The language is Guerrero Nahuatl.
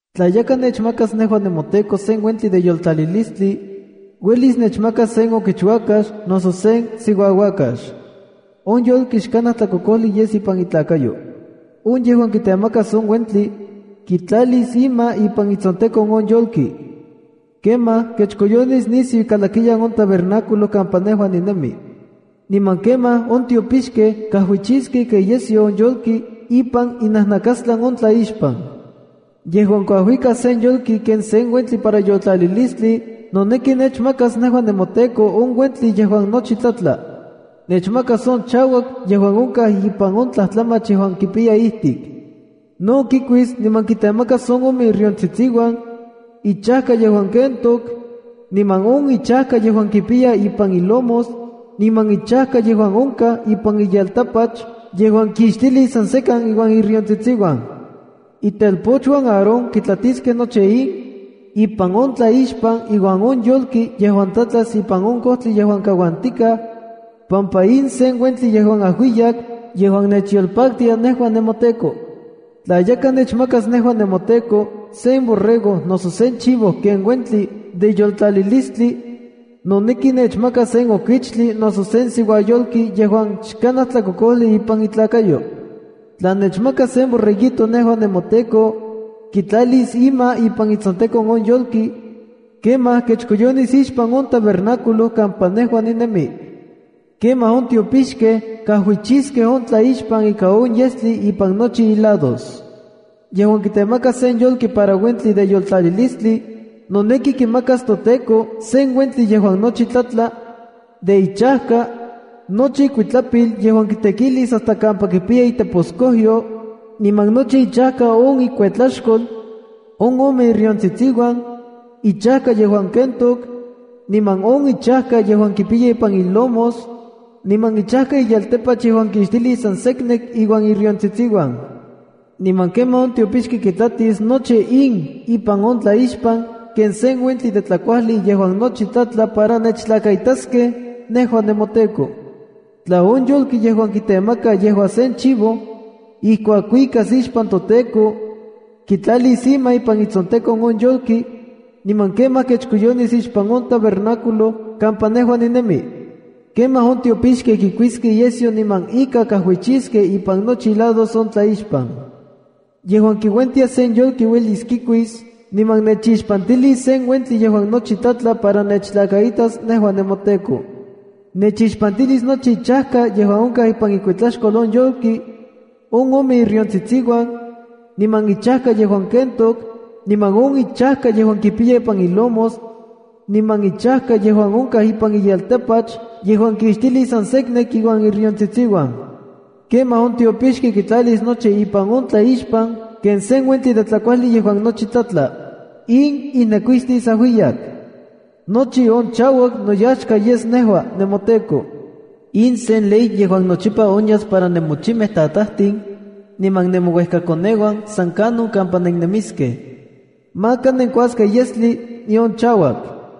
’Tla yakaj nechmakas nejua nemoTEKO sen uentli de yoltlalilistli, uelis nechmakas sen okichuakax noso sen siuauakax. On yolki xkanaj tlakokojli yes ipan itlakayo. On yejuan kitemakas on uentli, kitlalis ima ipan itsontekon on yolki. Kemaj kechkoyonis nisiu ikalakiyan on tabernáculo kampa nejua ninemi. Niman kemaj on tiopixkej kajuichiskej ika iyesyo on yolki ipan inajnakastlan on tlaixpan. ’Yejuan kuajuikas sen yolki ken uentli para yoltlalilistli noneki nechmakas nejua nemoTEKO on uentli yejuan nochi tlatla. Nechmakas on chauak yejuan onkaj ipan on tlajtlamach yejuan kipiya ijtik. No kikuis niman kitemakas on ome iriontsitsiuan, ichajka yejuan kentok, niman on ichajka yejuan kipiya ipan ilomos, niman ichajka yejuan onkaj ipan iyeltapach yejuan kixtilis san sekan iuan on iriontsitsiuan. Itelpochuan Aarón kitlatiskej nochi in, ipan on tlaixpan iuan on yolki yejuan tlatlas ipan on kojtli yejuan kauantikaj, pampa in sen uentli yejuan ajuiyak yejuan nechyolpaktia nejua nemoTEKO. ’Tla yakaj nechmakas nejua nemoTEKO sen borrego noso sen chivo ken uentli de yoltlalilistli, noneki nechmakas sen okichtli noso sen siuayolki yejuan xkanaj tlakokojli ipan itlakayo. Tla nechmakas sen borreguito nejua nemoTEKO, kitlalis ima ipan itsontekon on yolki, kemaj kechkoyonis ixpan on tabernáculo kampa nejua ninemi. Kemaj on tiopixkej kajuichiskej on tlaixpan ika on yestli ipan nochi ilados. ’Yejuan kitemakas sen yolki para uentli de yoltlalilistli, noneki kimakas toTEKO sen uentli yejuan nochi tlatla, de ichajka, nochi ikuitlapil yejuan kitekilis hasta kampa kipiya itepotskojyo, niman nochi ichajka on ikuetlaxkol, on ome iriontsitsiuan, ichajka yejuan kentok, niman on ichajka yejuan kipiya ipan ilomos, niman ichajka iyeltapach yejuan kixtilis san seknek iuan iriontsitsiuan. Niman kemaj on tiopixki kitlatis nochi in ipan on tlaixpan ken sen uentli de tlakuajli yejuan nochi tlatla para nechtlakaitaskej nejua nemoTEKO. ’Tla on yolki yejuan kitemaka yejua sen chivo, ijkuak kuikas ixpan toTEKO, kitlalis ima ipan itsontekon on yolki, niman kemaj kechkoyonis ixpan on tabernáculo kampa nejua ninemi. Kemaj on tiopixkej kikuiskej iyesyo niman ika kajuichiskej ipan nochi ilados on tlaixpan. ’Yejuan kiuentia sen yolki uelis kikuis niman nechixpantilis ken uentli yejuan nochi tlatla para nechtlakaitas nejua nemoTEKO. Nechixpantilis nochi ichajka yejuan onkaj ipan ikuetlaxkol on yolki, on ome iriontsitsiuan, niman ichajka yejuan kentok, niman on ichajka yejuan kipiya ipan ilomos, niman ichajka yejuan onkaj ipan iyeltapach yejuan kixtilis san seknek iuan iriontsitsiuan. Kemaj on tiopixki kitlatis nochi ipan on tlaixpan ken sen uentli de tlakuajli yejuan nochi tlatla. In ijnekuistis ajuiyak. Nochi on chauak noyaxka yes nejua nemoTEKO. ’In sen ley yejuan nochipa onyas para nemochimej tatajtin niman nemouejkakoneuan san kanon kampa nennemiskej: Maka nenkuaskej yestli, nion chauak.”